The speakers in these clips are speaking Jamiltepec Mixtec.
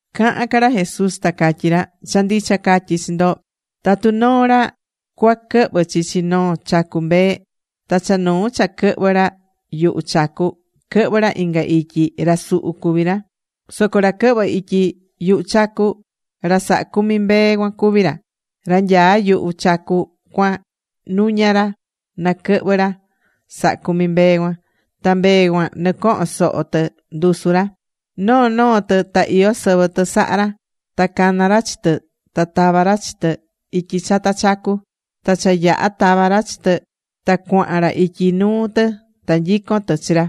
Cahán ca ra Jesús ta catyí ra: ―Cha ndicha catyí chi ndo, tatu noo ra cuaquɨhvɨ chichi noo chacu mbee, ta cha nuu cha quɨhvɨ́ ra yuhu chacu, quɨhvɨ́ ra inga ityi, ra suhu cuví ra. Soco ra quɨhvɨ́ ityi yuhu chacu, ra sahá cumi mbee cuan cuví ra. Ra nyaá yuhu chacu cuan nuña ra na quɨhvɨ ra sahá cumi mbee cuan. Ta mbee cuan nɨcohón soho tɨ ndusu ra. Noo noo tɨ ta iyó sɨvɨ tɨ sahá ra, ta cana ra chi tɨ ta tavá ra chi tɨ ityi chata chacu. Ta cha yaha̱ tava̱ ra chi tɨ, ta cuahan ra ityi nuu tɨ ta nyicón tɨ chi ra,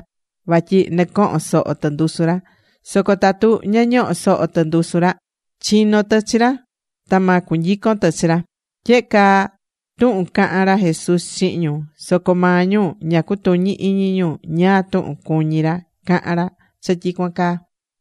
vatyi nɨcohón soho tɨ ndusu ra. Soco tatu ña ñohó soho tɨ ndusu ra, chinó tɨ chi ra ta ma cunyicon tɨ chi ra. Tyehe caa tuhun caha̱n ra Jesús chihin ñu. Soco maa ñu ña cutuñí iñi ñu ñáá tuhun cuñí ra cahán ra cha tyicuan caa.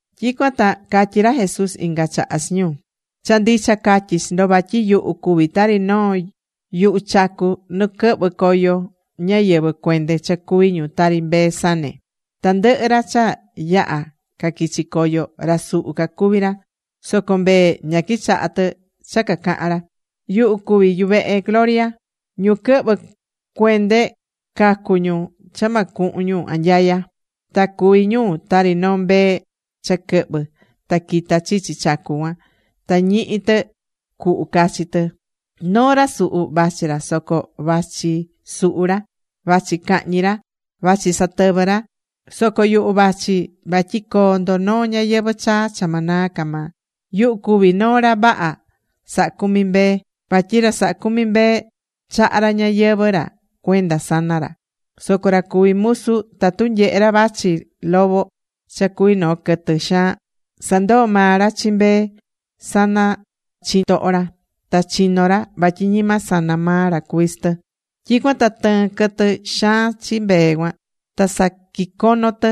Tyicuan ta catyí ra Jesús inga chaha chi ñu: ―Cha ndicha catyí chi ndo vatyi yuhu cuví tari noo yuhu chacu nu quɨhvɨ́ coyo ñáyɨvɨ cuende cha cuví ñu tari mbee sane. Tandɨhɨ ra cha yaha̱ caquichi̱ coyo, ra suhu cacuví ra. Soco mbee ña quichaha̱ tɨ cha cacaha̱n ra. Yuhu cuví yuvehe gloria. Ñu quɨhvɨ̱ cuende, cacu̱ ñu cha ma cuhun ñu anyaya. Ta cuví ñu tari noo mbee cha quɨhvɨ́ ta quitá chichi chacu cuan. Ta ñihí tɨ cuhu cachi tɨ. ’Noo ra suhu vachí ra, soco vachí suhu ra, vachí cahñi ra, vachí satɨvɨ ra. Soco yuhu vachí vatyi coo ndo noo ñayɨvɨ̱ chaa cha ma naa ca maa. Yuhu cuví noo ra vaha sahá cumi mbee. Vatyi ra sahá cumi mbee chahá ra ñayɨvɨ̱ ra cuenda sana ra. Soco ra cuví musu, tatu nyehé ra vachí lobo cha cuví noo quɨtɨ xaan, sandoo maa ra chi mbee sana chitoho ra. Ta chinó ra. Vatyi ñima sana maa ra cuví tɨ. Tyicuan ta tɨɨn quɨtɨ xaan chi mbee cuan. Ta saquicono tɨ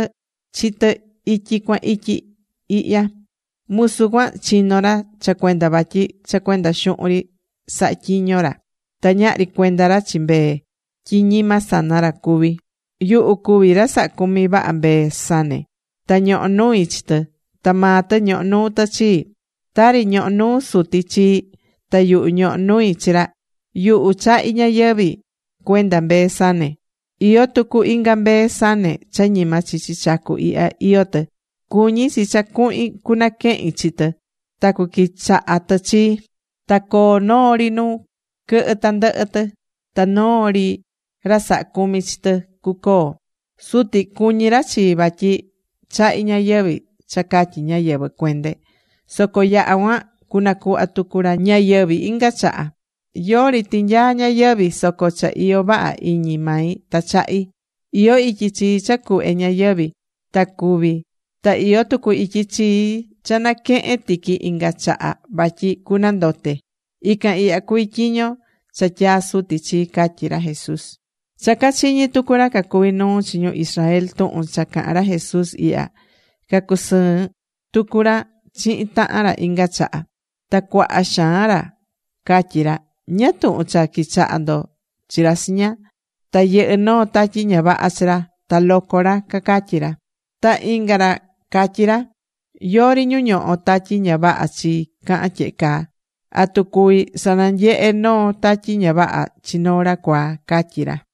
chi tɨ ityi cuan ityi ihya. Musu cuan chino ra cha cuenda vatyi cha cuenda xuhun ri sahá tyiño ra. Ta ñahri cuenda ra chi mbee, tyi ñima sana ra cuví. ’Yuhu cuví ra sahá cumi vaha mbee sane. Ta ñohó nui chi tɨ. Ta maa tɨ ñohó nuu tɨ chii, tari ñohó nuu Suti chii, ta yuhu ñohó nui chi ra. Yuhu chahí ñayɨvi̱ cuenda mbee sane. Iyó tucu inga mbee sane cha ñima chichi chacu ihya iyó tɨ. Cuñí chi cha cuhin cunaquehin chi tɨ. Ta cuquichaha tɨ chii. Ta coo noo ri nu quɨhɨ tandɨhɨ tɨ. Ta noo ri ra sahá cumi chi tɨ cucoo. ’Suti cuñí ra chii vatyi chahí ñayɨvi̱ cha catyi ñáyɨvɨ cuende. Soco yaha cuan, nacuhva tucu ra ñayɨvi̱ inga chaha. Yori tinyaá ñayɨvi̱, soco cha iyó vaha iñi mai ta chahí. Iyó ityi chii cha cuhve ñayɨvi̱ ta cúvi, ta iyó tucu ityi chii cha naquehen tiqui inga chaha vatyi cunandote. Ican ihya cuví tyiño cha tyaa̱ Suti chii ―catyí ra Jesús. Cha cachiñi̱ tucu ra cacuví nuu chi ñu Israel tuhun cha cahán ra Jesús ihya, cacusɨɨ̱n tucu ra chihin tahan ra inga chaha. Ta cuaha xaan ra catyí ra: ―¿Ñáá tuhun cha quichaha ndo chi ra chiña? Ta yɨhɨ́ noo tatyi ña vaha chi ra, ta loco ra ―cacatyí ra. Ta inga ra catyí ra: ―Yori ñu ñohó tatyi ña vaha chi cahán tyehe caa. ¿Atu cuví sananyehe noo tatyi ña vaha chi noo ra cuaa? ―catyí ra.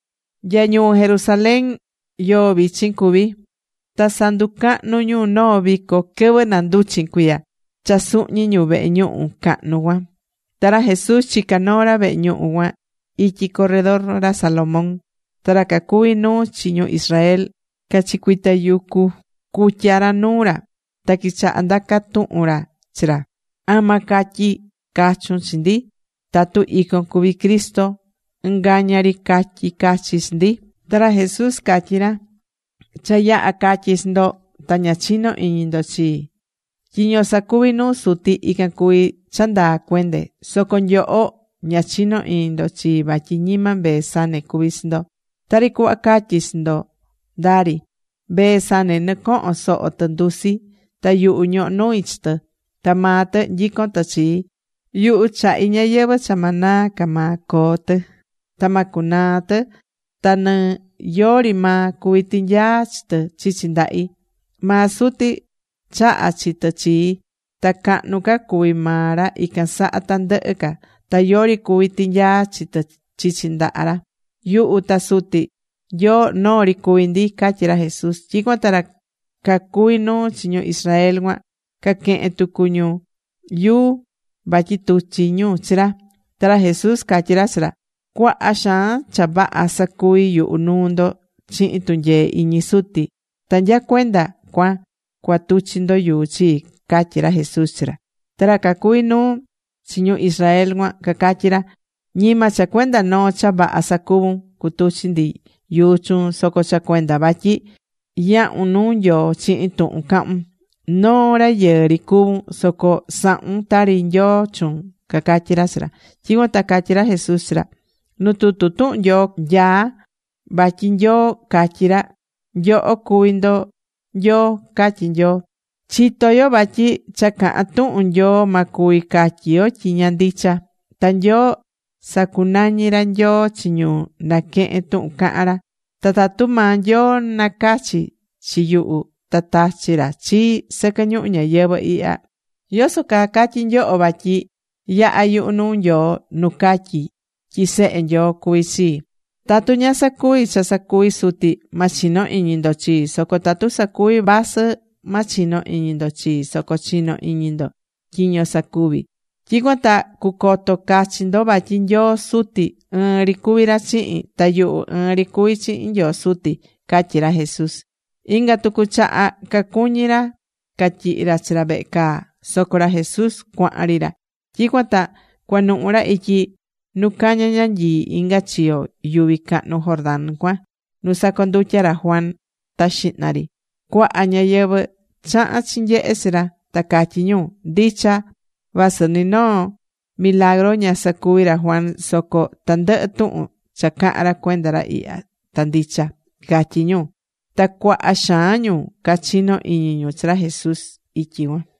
Nya ñuu Jerusalén yoo vichin cuví. Ta sanducahnú ñu noo vico quɨvɨ nanduchin cuiya cha suhñi̱ ñu vehe ñuhu cahnu cuan. Ta ra Jesús chicá noo ra vehe ñuhu cuan ityi corredor ra Salomón. Ta ra cacuví nuu chi ñu Israel cachicuitayucu̱ cutya ra nuu ra. Ta quichaha̱ ndaca tuhun ra chi ra: ―¿Ama catyi cachun chi ndi tatu icon cuví Cristo? ɨngaña ri ca̱tyi cachi chi ndi. Ta ra Jesús catyí ra: ―Cha yaha̱ catyi chi ndo, ta ña chinó iñi ndo chii. Tyiño sacuví nuu Suti ican cuví cha ndaa cuende. Soco nyoho ña chinó iñi ndo chii vatyi ñima mbee sane cuví chi ndo. Tari cuhva catyi̱ chi ndo ndaa ri. Mbee sane nɨcohón soho tɨ ndusi, ta yuhu ñohó nui chi tɨ. Ta maa tɨ nyicón tɨ chii. Yuhu chahí ñayɨvɨ̱ cha ma naa ca maa coo tɨ. Ta ma cunaa tɨ. Ta ni yori maa cuví tinyaa chi tɨ chichi ndahi. Maa Suti chaha̱ chi tɨ chii. Ta cahnu ca cuví maa ra ican saha tandɨhɨ ca. Ta yori cuví tinyaa chi tɨ chichi ndaha ra. Yuhu ta Suti Nyoo, noo ri cuví ndi ―catyí ra Jesús. Tyicuan ta ra cacuví nuu chi ñu Israel cuan caquehe̱n tucu ra yuu vatyi tuchi ra chi ra. Ta ra Jesús catyi ra chi ra: ―Cuaha xaan cha vaha sacuvi̱ yuhu nuu ndo chihin tunyee iñi Suti. ¿Ta nya cuenda cuan cua tuchi ndo yuu chii? ―catyí ra Jesús chi ra. Ta ra cacuví nuu chi ñu Israel cuan cacatyí ra: ―Ñima cha cuenda noo cha vaha sacuvu̱n cutuchi ndi yuu chuun, soco cha cuenda vatyi yahun nuu Nyoo chihin tuhun cahún. Noo rayɨɨ ri cuvún, soco sahún tari Nyoo chuun ―cacatyí ra chi ra. Tyicuan ta catyí ra Jesús chi ra: ―Nu tutu tuhun Nyoo nyaá vatyi Nyoo catyí ra: “Nyoho cuví ndo nyoo”, catyí Nyoo. Chitó yo vatyi cha cahán tuhun Nyoo, ma cuvi catyi yo tyi ña ndicha. Ta Nyoo sacunañí ra nyoo chi ñu naquehén tuhun cahán ra. Ta tatu maa Nyoo nacachi̱ chi yuhu ta tachi̱ ra chii sɨquɨ ñuhu ñayɨvɨ̱ ihya ¿yoso caa catyí nyoho vatyi yahá yuhu nuu Nyoo nu catyí tyi Sehe Nyoo cuví chii? Tatu ña sacuví cha sacuví Suti, ma chino iñi ndo chii. Soco tatu sacuví, vasɨ ma chino iñi ndo chii, soco chi̱no iñi ndo tyiño sacuví. Tyicuan ta cucoto cachi ndo vatyi Nyoo Suti ɨɨn ri cuví ra chihin. Ta yuhu ɨɨn ri cuví chihin Nyoo Suti ―catyí ra Jesús. Inga tucu chaha cacuñi̱ ra catyihi ra chi ra vehe caa, soco ra Jesús cuahan ri ra. Tyicuan ta cuanuhu̱ ra ityi nu caña ñanyii inga chiyo yuvi cahnu Jordán cuan nu sacondutya̱ ra Juan ta xihna ri. Cuaha ñáyɨvɨ chaha̱n chinyehe chi ra, ta catyí ñu: ―Ndicha, vasɨ ni noo milagru ña sacuvi̱ ra Juan, soco tandɨhɨ tuhun cha caha̱n ra cuenda ra ihya ta ndicha ―catyí ñu. Ta cuaha xaan ñu cachino̱ iñi ñu chi ra Jesús ityi cuan.